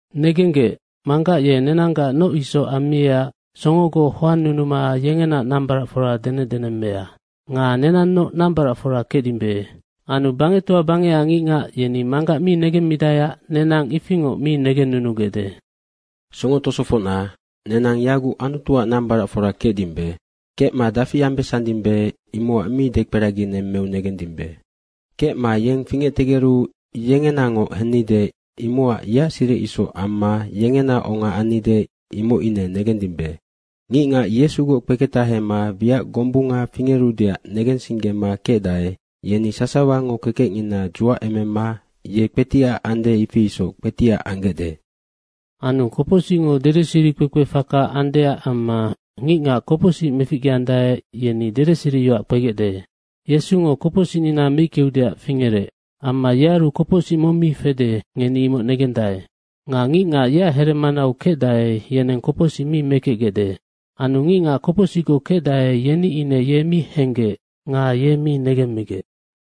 Negenggec, Manggac ye nenanggac noc isoc ammiecac songogoc hoannunuma yengena nambaracfora denecdenemmea. Nga nenannoc nambaracfora kecdimbe. Anu bangectoa bangecac ngicngac yeni Manggac mi negemmidaeac nenang ifingoc mi negennunugecde. Songo tosofocna, nenang yaguc Anutuac nambaracfora kecdimbe. Kecma dafi ambesandimbe, imocac mi dekperaginemmeu negendimbe. Kecma yeng fingectegeru yengenangoc hennide imocac yeac siric isoc amma yengena onga annide, imoc ine negendimbe. Ngicngac Yesugoc kpeketahema wiac gombunga fingerudeac negensinggema kecdae, yeni sasawango kekecngina dzuacemema ye kpetiac, ifi isoc kpetiac anggecde. Anu kopocsicngo dedeseri kpekpefaka andeac amma ngicngac kopocsic meficgeandae, yeni dedeseriyoac kpegecde. Yesungo kopocsicnina meickeudeac fingerec. Amma yearu kopocsic mong mi fede, ngeni imoc negendae. Nga ngicngac yeac heremanau kecdae, yeneng kopocsic mi mekecgecde. Anu ngicngac kopocsicgoc kecdae, yeni ine ye mi henggec nga ye mi negemmigec.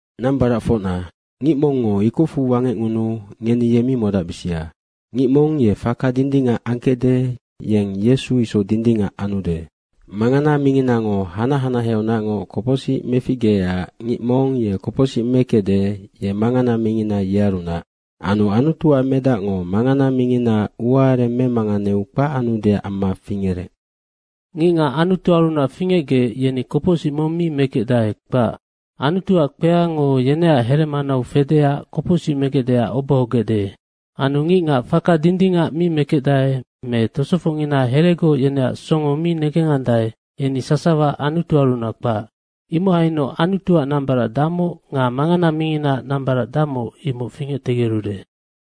Nambaracfocna, ngic mongngo ikocfu wangecngunuu ngeni ye mi modacbisia. Ngic mong ye faka dindingac angkecde, yeng Yesu isoc dindingac anude. Mangana minginango hanac hanaheaunacngoc kopocsic meficgeecac ngic mong ye kopocsic mekecde, yenoc mangana mingina yearunac. Anu Anutuac Medacngo mangana minginaac uaareng memanganeu kpac anudeac amma fingerec. Ngicngac Anutuarunac fingecgec, yeni kopocsic mong mi mekecdae, kpac. Anutuac kpeango yeneac heremanau fedeac kopocsic megecdeac obohogecde. Anu ngicngac faka dindingac mi mekecdae me tosofocngina heregoc yeneac songo mi negengandae, yeni sasawa Anutuarunac kpac. Imohainoc Anutuac nambarac damoc nga mangana minginaac nambarac damoc, imoc fingectegerude.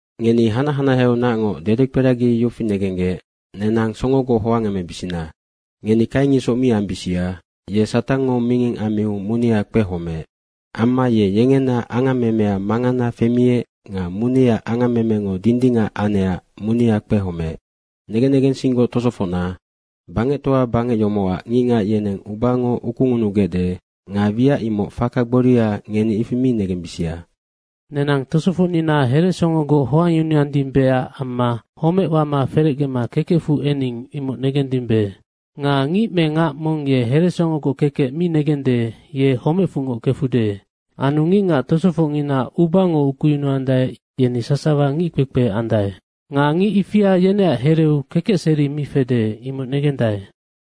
Ngeni hanac hanaheaunacngoc dedekperagi yofi negenggec, nenang songogoc hoangemebisina. Ngeni Kaing isoc mi ambisia. Ye Satangngo minging ammiu munea kpehomeec. Amma ye yengena angammemea mangana femiec nga muneaac angammemengo dindingac anecac munea kpehomeec. Negen negensinggoc tosofocna, bangectoa bangec yomocac ngicngac yeneng ubango ukungunugecde nga wiac imoc faka gboria, ngeni ifi mi negembisia. Nenang tosofocnina heresongogoc hoangyunuandimbeac amma homec wama ferecgema kekecfu ening, imoc negendimbe. Nga ngic me ngac mong ye heresongogoc kekec mi negende, ye homecfungoc kefude. Anu ngicngac tosofocngina ubango ukuyunuandae, yeni sasawa ngickpekpe andae. Nga ngic ifia yeneac hereu kekecseri mi fede, imoc negendae.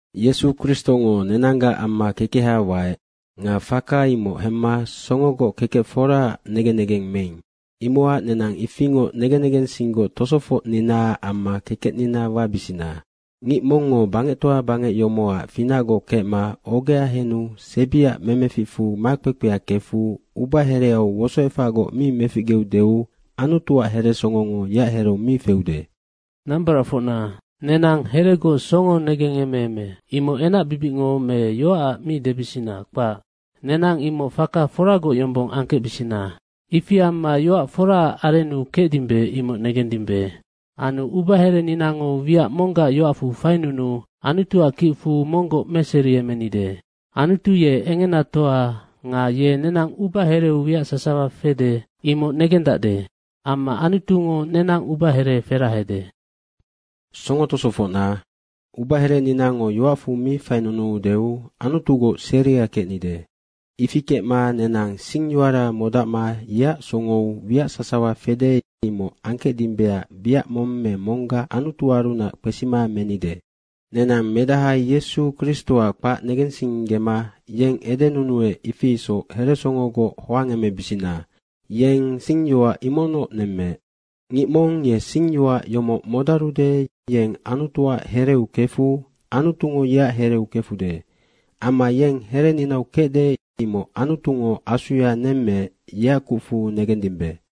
Yesu Kristongo nenanggac amma kekeha waec. Nga faka imoc hemma songogoc kekec foraac negen negeng meing. Imocac nenang ifingoc negen negensinggoc tosofocninaac amma kekecnina wabisina. Ngic mongngo bangectoa bangec yomocac finacgoc kecma ogea henu sebiaac memeficfu makpekpea kefu ubahereau wosoefacgoc mi meficgeudeu Anutuac heresongongo yeac hereu mi feude. Nambaracfocna, “Nenang heregoc songo negengemeeme.” Imoc enacbibicngo me yoacac mi debisina, kpac. Nenang imoc faka foragoc yombong angkecbisina. Ifi amma yoac foraac arennu kecdimbe, imoc negendimbe. Anu ubahereninango wiac monggac yoacfu fainunuu Anutuac kicfu monggoc meseriemenide. Anutu ye engenatoa nga ye nenang ubahereu wiac sasawa fede, imoc negendacde. Amma Anutungo nenang ubahere ferahede. Songo tosofocna, ubahereninango yoacfu mi fainunuudeu Anutugoc seria kecnide. Ifi kecma nenang singyoara modacma yeac songou wiac sasawa fede, imoc angkecdimbeac wiac mong me monggac Anutuarunac kpesima menide. Nenang Medaha Yesu Kristoac kpac negensinggema yeng edenunuec, ifi isoc heresongogoc hoangemebisina. Yeng singyoac imocnoc nemmeec. Ngic mong ye singyoac yomoc modarude, yeng Anutuac hereu kefu Anutungo yeac hereu kefude. Amma yeng hereninau kecde, imoc Anutungo Asuya nemmeec, yeac kucfu negendimbe.